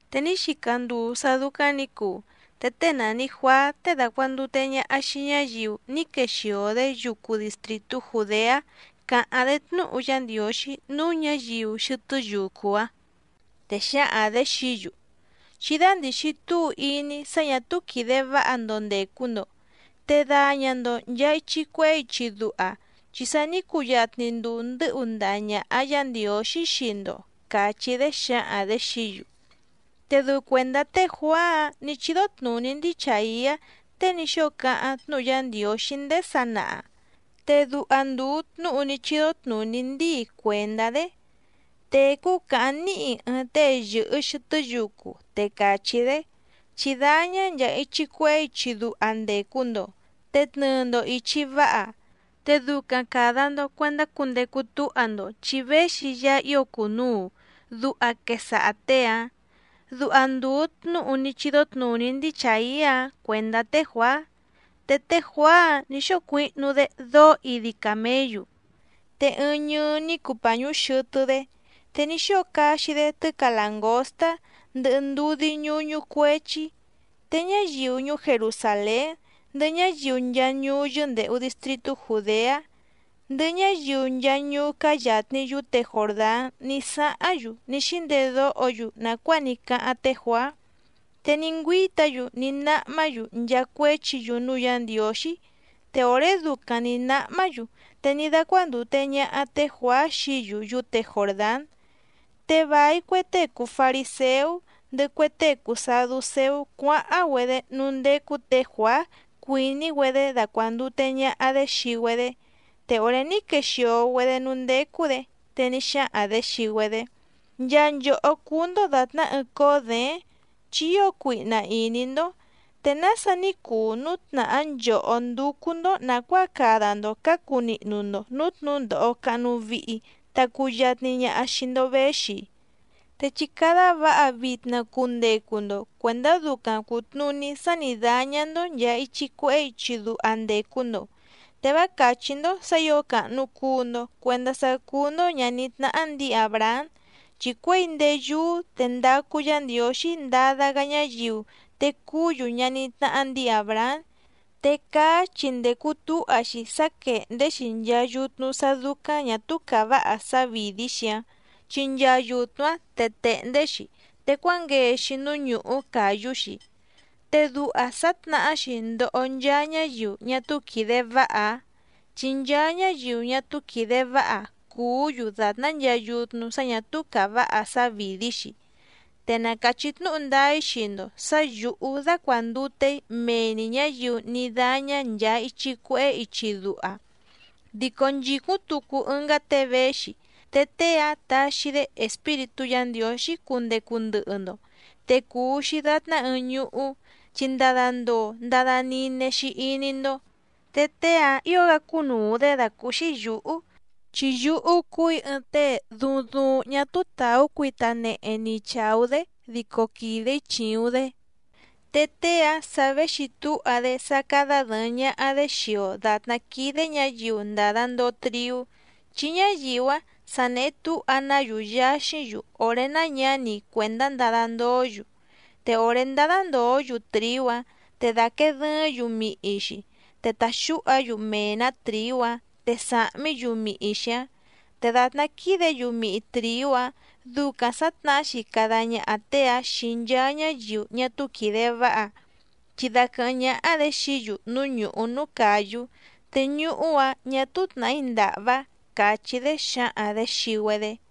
Te ní xica nduu sá dúcáⁿ nǐ cuu, te tée nàni Juaá tée dacuàndute ñaha xii ñáyiu ní quexìo‑dé yucu distrìtú Jùdeá càháⁿ‑dé tnúhu Yá Ndiǒxí núú ñǎyiu xɨtɨ́ yucu‑áⁿ. Te xǎhaⁿ‑dě xií‑yu: —Chí dándìxi túu iní sá ñà túú quìde váha‑ndo ndècu‑ndo, te daña‑ndo nchàa ichi cuehé ichi duha, chi sa ní cuyatni nduu ndɨ́hu ndaha ñàha Yá Ndiǒxí xii‑ndo —càchí‑dé xǎhaⁿ‑dě xií‑yu. Te dɨu cuèndá té Juàá‑áⁿ nǐ chídó tnùní ndíi Chàiá tée ní xóo cáháⁿ tnúhu Yá Ndiǒxí ndéé sanaha, te duha ndùu tnúhu ní chídó tnùní ndíi cuèndá‑dé: Tècú càháⁿ níhi ɨɨⁿ tée yɨ̀hɨ xɨtɨ́ yucu, te càchí‑dé: “Chí dáñá nchàa ichi cuehé ichi duha ndècu‑ndo, te tnɨɨ‑ndo ìchi váha, Te ducaⁿ càda‑ndo cuendá cundecu túha‑ndo chi véxi Yaá ío cùnuu”, duha quesaha těe‑áⁿ. Duha ndùu tnúhu ní chídó tnùní ndíi Chàiá‑áⁿ cuèndá té Juàá. Te té Juàá‑áⁿ nǐ xóo cuihnu‑dé dóó idi càméyu, te ɨɨⁿ ñɨɨ ní cuu pàñú xɨtɨ́‑dé, te ní xóo caxi‑dé tɨ́ca làngóstá ndɨhɨ ndudí ñúñú cuéchí. Te ñáyiu ñuú Jerusàlén, ndɨhɨ ñáyiu nchaa ñuú yɨ́ndèhu distritú Jùdeá, ndɨhɨ ñáyiu nchaa ñuú cáá yàtni yúte Jòrdán ní sáháⁿ‑yu ní xíndedóho‑yu nàcuáa ní cáháⁿ té Juàá. Te ní ngüíta‑yu ní náhmá‑yu nchaa cuéchi‑yu núú Yǎ Ndiǒxí. Te òré ducaⁿ nǐ náhmá‑yu te ní dácuándùte ñaha té Juàá xií‑yu yúte Jòrdán. Te vài cue tée cùu fariséú ndɨhɨ cue tée cùu saducéú cuáháⁿ‑güedé núú ndécú tě Juàá cuìní‑güedé dacuàndute ñaha‑dé xii‑güedé. Te òré ní quexìo‑güedé núú ndécú‑dě, te ní xáhaⁿ‑dě xii‑güedé: —¡Nchaa nchòhó cúú‑ndó dàtná ɨɨⁿ cóó děéⁿ chi ío cuihna ìní‑ndó! ¿Te nása ní cuu núu tnàhá nchòhó ndúcú‑ndó nàcuáa cada‑ndo cǎcu nihnu‑ndo nǔú tnǔndòho cahnu vihi ta cuyatni ñaha xii‑ndo véxi‑i? Te chí cádá vǎha vitna cundecu‑ndo cuèndá ducaⁿ cùtnuní sá nǐ dáñá‑ndó nchàa ichi cuehé ichi duha ndècu‑ndo. Te vá càchí‑ndó sǎ ǐo càhnu cuu‑ndo cuendá sá cúú‑ndó ñàní tnáhá ndǐi Àbrahám. Chi cuěi ndéé yúú te ndacu Yá Ndiǒxí ndada‑gá ñáyiu te cuú‑yu ñaní tnáhá ndǐi Àbrahám. Te caá chi ndècu túha‑xi sá quèhndé‑xi nchaa yutnu sá dúcáⁿ ñà túú càváha sávìdí‑xi‑áⁿ, chi nchaa yutnu‑áⁿ tèhndé‑xi te cuángee‑xi núú ñùhú càyú‑xi. Te duha sǎtnàhá‑xi ndoho nchaa ñáyiu ñá túú quìde váha‑áⁿ chi nchaa ñáyiu ñá túú quìde váha cùú‑yu dàtná nchaa yutnu sá ñà túú càváha sávìdí‑xi. Te na càchí tnúhu ndáá‑í xii‑ndo sǎ yǔhú dácuàndute‑í mee‑ni ñǎyiu ní dáñá nchàa ichi cuehé ichi duha. Dico nchìcúⁿ tucu ɨngá tée véxi, te tée‑áⁿ taxi‑dé Espíritú Yǎ Ndiǒxí cundecu ndɨhɨ‑ndo. Te cùu‑xi datná ɨɨⁿ ñuhú, chi ndada ndoo ndada nine‑xi iní‑ndó. Te tée‑áⁿ ǐo‑gá cúnùu‑dé dàcúúxí yǔhú, chi yúhú cúù‑í ɨɨⁿ tée duuⁿ duuⁿ ñá túú tàú cuita nehe ni chàú‑dé dico quìde‑í chìuⁿ‑dé. Te tée‑áⁿ sa véxi túha‑dé sá cádá dɨ̀ɨⁿ ñaha‑dé xii‑o dàtná quídé ñǎyiu ndàda ndoo triú, chi ñáyiu‑áⁿ sa nèhe túha‑ná‑yu yaxíⁿ‑yu òré náñǎni cuèndá ndada ndoó‑yu. Te òré ndádá ndòó‑yu trìú‑áⁿ te dàquee dɨɨ́ⁿ‑yu mihi‑xi, te tàxúha‑yu mee‑nǎ trìú‑áⁿ te sàhmí‑yu mihi‑xi‑áⁿ. Te dàtná quídě‑yu mihi trìú‑áⁿ ducaⁿ sǎtnahá‑xi cada ñaha tée‑áⁿ xii nchaa ñáyiu ñá túú quìde váha, chi daquɨ̀hɨ́ⁿ ñáhá‑dě xií‑yu núú ñùhú núú càyú, te ñuhú‑áⁿ ñà túú tnàhí ndàhvá —càchí‑dé xǎhaⁿ‑dě xii‑güedé.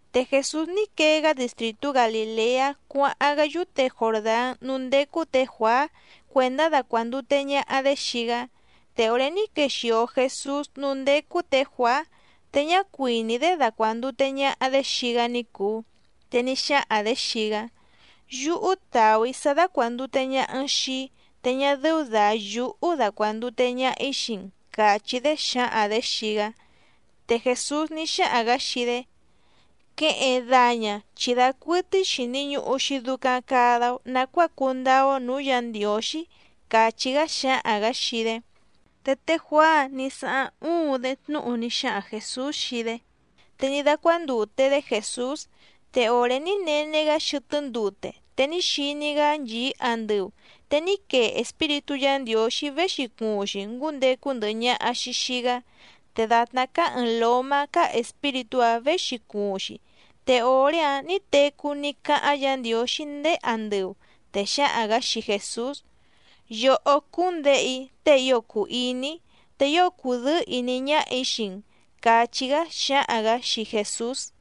Te Jèsús ní quee‑gá distrìtú Galìleá cuáháⁿ‑gá yúte Jòrdán núú ndécú tě Juàá cuèndá dacuàndute ñaha‑dé xii‑gá. Te òré ní quexìo Jesús núú ndécú tě Juàá, te ñá cuìní‑dé dacuàndute ñaha‑dé xii‑gá ní cùu, te ní xáhaⁿ‑dě xii‑gá: —Yúhú tàú‑í sá dácuàndute ñaha‑n xii‑í, te ñá dɨ́ú dà yúhú dacuàndute ñaha‑í xii‑n —càchí‑dé xǎhaⁿ‑dě xii‑gá. Te Jèsús ní xáhaⁿ‑gǎ xii‑dé: —Queheⁿ daña, chi dacuɨtɨ́í xìni ñuhu‑xi ducaⁿ cada‑o nacuáa cundáá‑ó nǔú Yǎ Ndiǒxí —càchí‑gá xǎhaⁿ‑gǎ xii‑dé. Te té Juàá‑áⁿ nǐ sáháⁿ uuⁿ‑dé tnúhu ní xáhaⁿ Jèsús xii‑dé. Te ní dácuándùte‑dé Jèsús. Te òré ní nene‑gá xɨtɨ́ ndute te ní xiní‑gá nchìí andɨu, te ní quee Espíritú Yǎ Ndiǒxí véxi cuuⁿ‑xi ngúndecu ndɨhɨ ñaha‑xi xìi‑gá, te dàtná cáá ɨ̀ɨⁿ lómá cáá Espíritú‑áⁿ věxi cuuⁿ‑xi. Te òré‑áⁿ nǐ tecú ní cáháⁿ Yǎ Ndiǒxí ndéé andɨu, te xǎhaⁿ‑gǎ xii Jèsús: —Yòhó cúú‑n Děhe‑í tée ío cùu iní‑í te ío cùdɨ́ɨ́ ìní ñáhà‑í xii‑n —càchí‑gá xǎhaⁿ‑gǎ xii Jèsús.